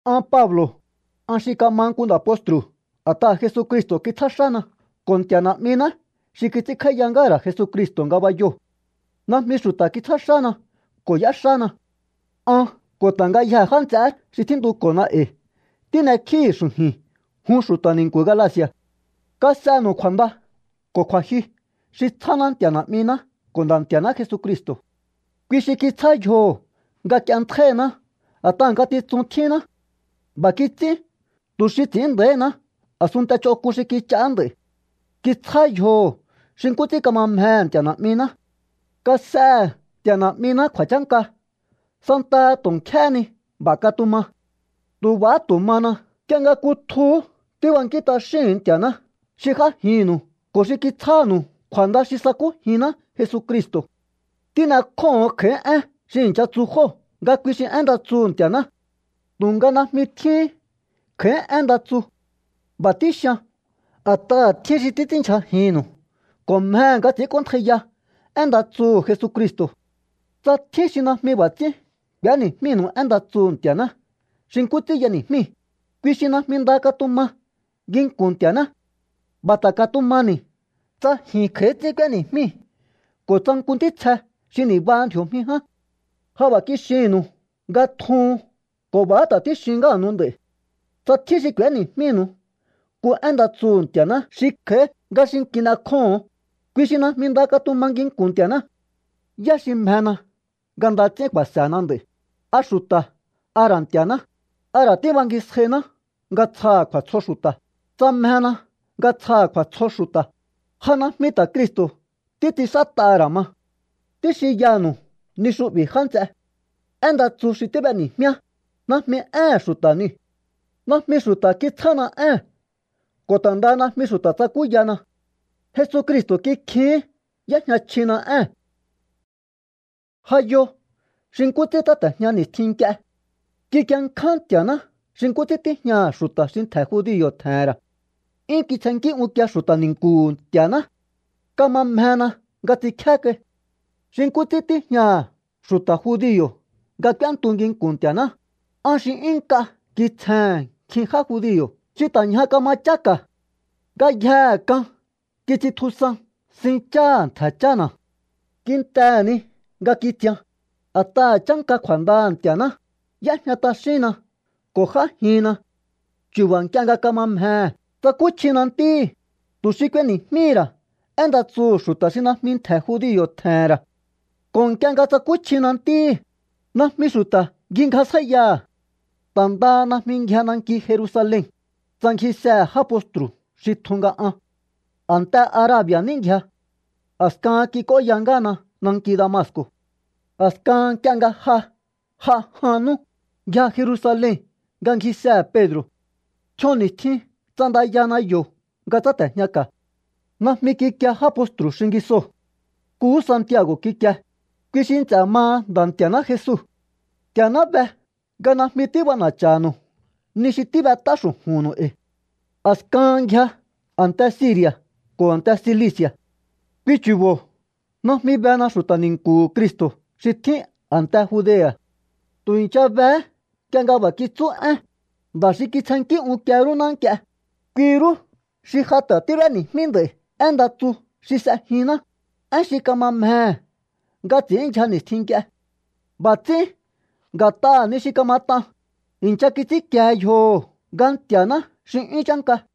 An Pablo̱, an xi kama nku nda̱ postru̱ a̱t'aha̱ Jesucristo̱ kitsjá xána ko̱ Nti̱a̱ Na̱'miná xi kits'ínkj'áíya ngáha̱ ra̱ Jesucristo̱ ngabayoo̱. Najmi xu̱ta̱ kitsjá xána ko̱ y'éxána. An ko̱ ta̱ ngayjee̱ já nts'eé xi tjíntuko̱na e̱i̱ tín'ekjíi̱hi̱ xu̱ju̱i̱n jun xu̱ta̱ ni̱nku̱ Galaci̱a̱. Kas'enu̱u kju̱a̱nda ko̱ kju̱a̱jyu xi tsjáná Nti̱a̱ Na̱'miná ko̱ Nda̱ Nti̱a̱ná Jesucristo̱. Kui xi kitsjá yjoho̱ nga k'ienntjáíhiná a̱t'aha̱ ngatitsun tjínná. B'a̱ kits'ín tu̱ xi ts'i̱ín nda̱íhiná a̱sunnte ch'onk'un xi kich'aá nd'a̱i̱. Kitsjá yjoho̱ xi nkú ts'ín kama mjehe̱ Nti̱a̱ Na̱'miná. ¡Kas'ehe̱ Nti̱a̱ Na̱'miná kju̱a̱chánka santaha tu̱ nkjéhé ni! B'a̱ katuma. Tu̱ b'a̱há tu̱ mana nk'ie nga kutjuhú tíbankín t'axíhu̱un Nti̱a̱ná xi j'ájinnu̱u ko̱ xi kitsjánu̱u kju̱a̱nda xi sakújinná Jesucristo̱. Tín'ekjóho̱on kj'a̱í én xi i̱ncha tsu jóo̱ nga kui xi én nda tsuhu̱ Nti̱a̱ná. Tu̱nga najmi tjíhín kj'a̱í én nda tsu. B'a̱ tíxian a̱t'aha̱ tjín xi títs'ínndyjajinnu̱u ko̱ mjehe̱ nga ts'i̱ínk'óntjaiya én nda tsuhu̱ Jesucristo̱. Tsa tjín xi najmi b'a̱ ts'ín k'u̱éni̱jmínu̱u én nda tsuhu̱ Nti̱a̱ná xi nkú ts'ín y'eni̱jmíi̱, kui xi najmi nda katuma nginku̱n Nti̱a̱ná. B'a̱ ta̱ katumani̱ tsa ji̱n kj'a̱í ts'ín k'úéni̱jmíi̱ ko̱ tsa nku ntítsje xi ni̱baha ndji̱o̱jmi ján. Ja b'a̱ kixinnu̱u nga tjuhun ko̱ b'a̱há ta̱ tíxin ngáha̱nu̱u nd'a̱i̱. Tsa tjín xi k'u̱éni̱jmínu̱u nku én nda tsuhu̱ Nti̱a̱ná xi kj'a̱í nga xi kin'ekjóho̱on, kui xi najmi nda katuma nginku̱n Nti̱a̱ná. ¿Yá xi mjena nga nda ts'ín ku̱a̱se̱na nd'a̱i̱? ¿A xu̱ta̱ a ra̱ Nti̱a̱ná? ¿A ra̱ tíbangisjainá nga tsjaha̱ kju̱a̱tsjo xu̱ta̱? Tsa mjena nga tsjaha̱ kju̱a̱tsjo xu̱ta̱, ja najmi ta̱ Cristo̱ títs'inxát'aha̱ ra̱ ma. Tíxinyanu̱u ni xu'bi̱, já nts'e. Én nda tsu xi tíb'eni̱jmíá, najmi éhe̱n xu̱ta̱ niu̱. Najmi xu̱ta̱ kitsjána ée̱n ko̱ ta̱ ndaha najmi xu̱ta̱ tsakúyana. Jesucristo̱ kikjihín y'éjña chjina ée̱n. Ja yo xi nkú ts'ín tsáte̱jña ni̱stjin nk'ie. Kikienkján Nti̱a̱ná xi nkú ts'ín tíjñaha̱ xu̱ta̱ xi ntje̱ judio̱ tje̱he̱n ra̱. 'Yún kitsjennkí unkie xu̱ta̱ ni̱nku̱hu̱ Nti̱a̱ná. Kama mjena nga ts'inkjé kai. Xi nkú ts'ín tíjñaha̱ xu̱ta̱ judio̱ nga k'úéntu nginku̱n Nti̱a̱ná, an xi 'yún nk'a kitsjehe̱n nkjin já judio̱ xi ta̱ ñja kama cháka̱. Ngayjehe k'an kits'intjusan sin cháha̱ ntje̱ chána̱. Kintehe̱ ni nga kitsian, a̱t'aha̱ chánka kju̱a̱ndaha̱ Nti̱a̱ná, y'éjña t'axínna ko̱ j'ájinna. Chu̱ba̱ nk'ie nga kama mjehe̱ tsakúchjina Ntíhi̱, tu̱ xi k'ueni̱jmíhi̱ ra̱ én nda tsuhu̱ xu̱ta̱ xi najmi ntje̱ judio̱ tje̱he̱n ra̱. Ko̱ nk'ie nga tsakúchjina Ntíhi̱, najmi xu̱ta̱ ngjingjasjáíyaha̱. Ta̱ ndaha najmi ngjia nanki Jerusalen, tsa ngjisehe̱ já postru̱ xi tjun nga an. A̱nte Arabi̱a̱ ní ngjia. A̱skahan kik'óya ngáhana nanki Damasco̱. A̱skahan nk'ie nga ja j'a jan nú, ngjia Jerusalen nga ngjisehe̱ Pedro̱. Tj'ion ni̱stjin ts'andayana yo̱ nga tsáte̱jñaka̱. Najmi kikie já postru̱ xingisoo̱. Nkuhú Santiago̱ kikie, kui xi nts'e̱ maha Nda̱ Nti̱a̱ná Jesu. ¡Nti̱a̱ná be nga najmi tíb'ana̱cha̱nu̱u ni xi tíb'et'á xu̱ju̱nnu̱u e̱i̱! A̱skahan ngjia a̱nte Siri̱a̱ ko̱ a̱nte Cilici̱a̱. Kui chu̱bo̱ najmi bena xu̱ta̱ ni̱nku̱hu̱ Cristo̱ xi tjín a̱nte Judea̱. Tu̱ i̱ncha behé nk'ie nga b'a̱ kitsú én: “Nda̱ xi kitsjennkí unkie rúná nk'ie, kui rú xi ja ta̱ tíb'éni̱jmí nd'a̱i̱ én nda tsu xi s'ejinná, én xi kama mjehe̱ nga ts'i̱ínndyja ni̱stjin nk'ie.” B'a̱ ts'ín, nga̱t'aha̱ ni xi kamat'an, i̱ncha kits'ínkiehe yjoho̱ nga Nti̱a̱ná xi 'yún chánka.